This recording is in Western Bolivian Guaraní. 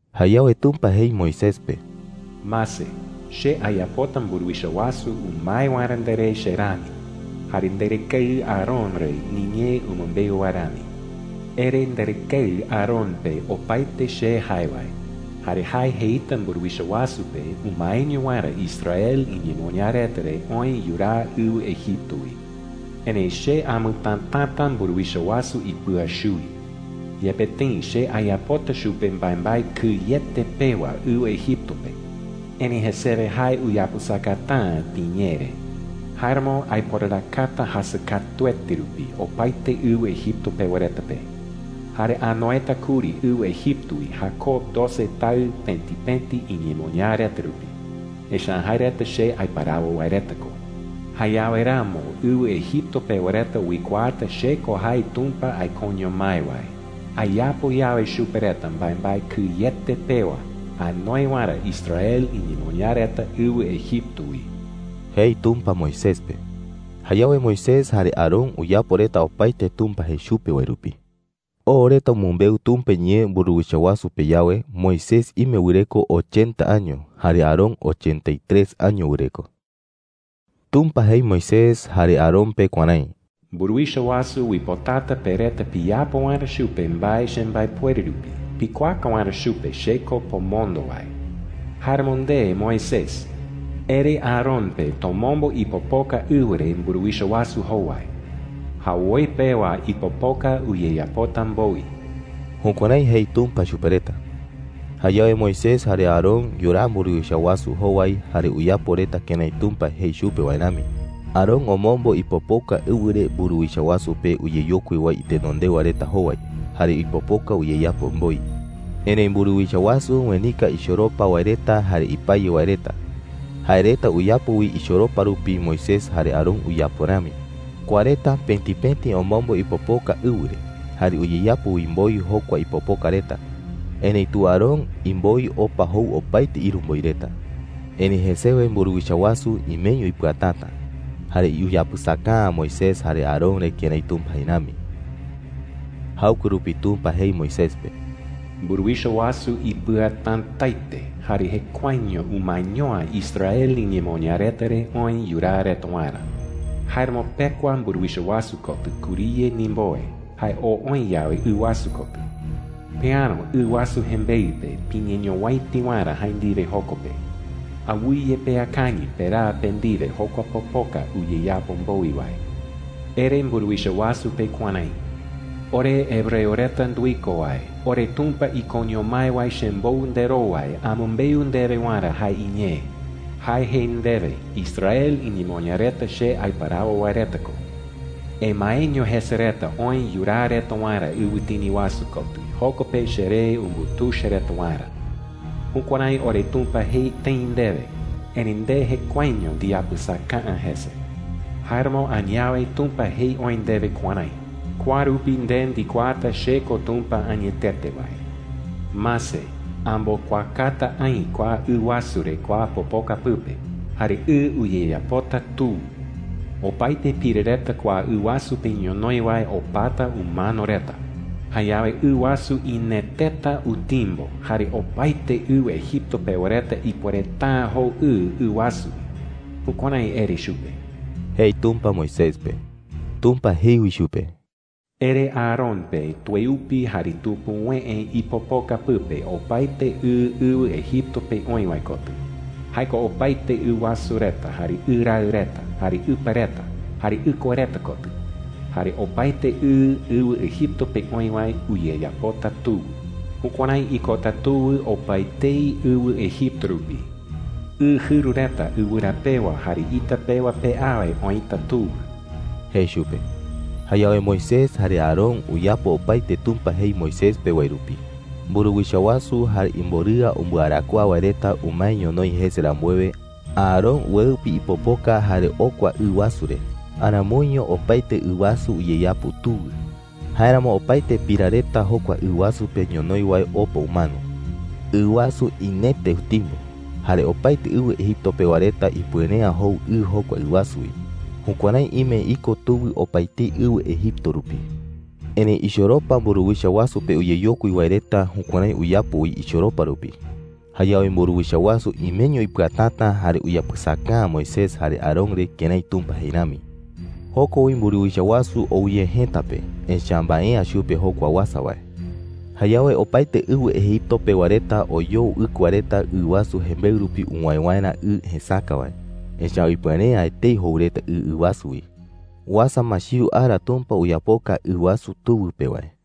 Jayawe Tumpa jei Moisés pe: “Mase, che ayapota mburuwicha wasu umae waerä nderé che rami, jare nderɨkeɨ Aarón re niñee umɨmbeu wae rami,” jei. “Ere nderɨkeɨ Aarón pe opaete che jae wae, jare jae jeita mburuwicha wasu pe umaeño waerä Israel iñemoñaa reta re oë yuraa ɨwɨ Egipto wi,” jei. “Erëi che amɨtätata mburuwicha wasu ipɨa chuwi. Yepe tëi che ayapota chupe mbaembae kɨyete pewa ɨwɨ Egipto pe, erëi jesewe jae uyapɨsakata’ä piñee re. Jáeramo aiporarakata jasɨ katuete rupi opaete ɨwɨ Egipto pewa reta pe. Jare anoeta kuri ɨwɨ Egipto wi Jacob doce taɨ pëti pëti iñemoñaa reta rupi. Echa’ä jae reta che aiparawo wae reta ko,” jei. “Jayawe ramo ɨwɨ Egipto pewa reta uikuaata che ko jae Tumpa aikoño mái wae, ayapo yawe chupe reta mbaembae kɨyete pewa anoe waerä Israel iñemoñaa reta ɨwɨ Egipto wi,” jei Tumpa Moisés pe. Jayawe Moisés jare Aarón uyapo reta opaete Tumpa jei chupe wae rupi. Oo reta umɨmbeu Tumpa iñee mburuwicha wasu pe yawe, Moisés ime wɨreko ochenta año, jare Aarón ochenta y tres año wɨreko. Tumpa jei Moisés jare Aarón pe kuärái: “Mburuwicha wasu uipotata pe reta piyapo waerä chupe mbae chembaepuere rupi pikuaaka waerä chupe che ko pomondo wae. Jáeramo nde Moisés, ere Aarón pe tomombo ipopoka ɨwɨ re mburuwicha wasu jowai,” jei. “Jawoi pewa ipopoka uyeyapota mboi.” Jukuärái jei Tumpa chupe reta. Jayawe Moisés jare Aarón yuraa mburuwicha wasu jowai, jare uyapo reta kërái Tumpa jei chupe wae rami. Aarón omombo ipopoka ɨwɨ re mburuwicha wasu pe uyeyokui wae itenondewa reta jowai, jare ipopoka uyeyapo mboi. Erëi mburuwicha wasu uenika ichoropa wae reta jare ipaye wae reta. Jae reta uyapo wi ichoropa rupi Moisés jare Aarón uyapo rami. Kua reta pëti pëti omombo ipopoka ɨwɨ re, jare uyeyapo wi mboi jokua ipopoka reta. Erëitu Aarón imboi opa jou opaete ïru mboi reta. Erëi jesewe mburuwicha wasu imeño ipɨatäta, jare uyapɨsaka’ä Moisés jare Aarón re kërái Tumpa jei rami. Jaɨkue rupi Tumpa jei Moisés pe: “Mburuwicha wasu ipɨatätaete jare jekuaeño umaeño’ä Israel iñemoñaa reta re oë yuraa reta waerä,” jei. “Jáeramo pekua mburuwicha wasu kotɨ kuriye ndimbowe, jae oo oï yawe ɨ wasu kotɨ. Peäro ɨ wasu jembeɨ pe piñeñowäiti waerä jae ndiwe joko pe. Awɨye peakañɨ peraa pe ndiwe jokua popoka uyeyapo mboi wae,” jei. “Ere mburuwicha wasu pe kuärái: ‘Ore hebreo reta nduiko wae, oreTumpa ikoño mái wae chembou nderowai amɨmbeu ndewe waerä jae iñee. Jae jei ndewe: ‘Israel iñemoñaa reta che aiparawo wae reta ko. Emaeño jese reta oë yuraa reta waerä ɨwɨtini wasu kotɨ, joko pe cheree umbutuicha reta waerä.’ Jukuärái oreTumpa jei tëi ndewe, erëi nde jekuaeño ndiyapɨsaka’ä jese. Jáeramo añawe Tumpa jei oï ndewe kuärái: ‘Kua rupi nde ndikuaata che ko Tumpa añetete wae. Mase, ambokuakata aï kua ɨ wasu re kua popoka pɨpe, jare ɨ uyeyapota tuwɨ. Opaete pira reta kua ɨ wasu pe ñonoï wae opata umano reta. Jayawe ɨ wasu ineteta utimbo, jare opaete ɨwɨ Egipto pewa reta ipuereta’ä jou ɨ ɨ wasu wi.’ Jukuärái ere chupe,” jei Tumpa Moisés pe. Tumpa jei wi chupe: “Ere Aarón pe tueupi jare tupuwëe ipopoka pɨpe opaete ɨ ɨwɨ Egipto pe oï wae kotɨ – jae ko opaete ɨ wasu reta, jare ɨ raɨ reta, jare ɨpa reta, jare ɨkua reta kotɨ. Jare opaete ɨ ɨwɨ Egipto pe oï wae uyeyapota tuwɨ. Jukuärái ikota tuwɨ opaetei ɨwɨ Egipto rupi. Ɨ jɨru reta ɨwɨra pewa jare ita pewa pe awe oïta tuwɨ,” jei chupe. Jayawe Moisés jare Aarón uyapo opaete Tumpa jei Moisés pe wae rupi. Mburuwicha wasu jare imborɨa umbɨarakuaa wae reta umae ñonoï jese rambuewe, Aarón ueupi ipopoka jare okua ɨ wasu re. Aramoiño opaete ɨ wasu uyeyapo tuwɨ. Jáeramo opaete pira reta jokua ɨ wasu pe ñonoï wae opa umano. Ɨ wasu inete utimbo, jare opaete ɨwɨ Egipto pewa reta ipuere’ä jou ɨ jokua ɨ wasu wi. Jukuärái ime iko tuwɨ opaetei ɨwɨ Egipto rupi. Erëi ichoropa mburuwicha wasu pe uyeyokui wae reta jukuärái uyapo wi ichoropa rupi. Jayawe mburuwicha wasu imeño ipɨatäta jare uyapɨsaka’ä Moisés jare Aarón re kërái Tumpa jei rami. Joko wi mburuwicha wasu oo ye jëta pe, echa’ä mbae’ä chupe jokua uasa wae. Jayawe opaete ɨwɨ Egipto pewa reta oyoo ɨkua reta ɨ wasu jembeɨ rupi uwäe waerä ɨ jesäka wae, echa’ä ipuere’ä etei jou reta ɨ ɨ wasu wi. Uasa ma chiu ara Tumpa uyapoka ɨ wasu tuwɨ pe wae.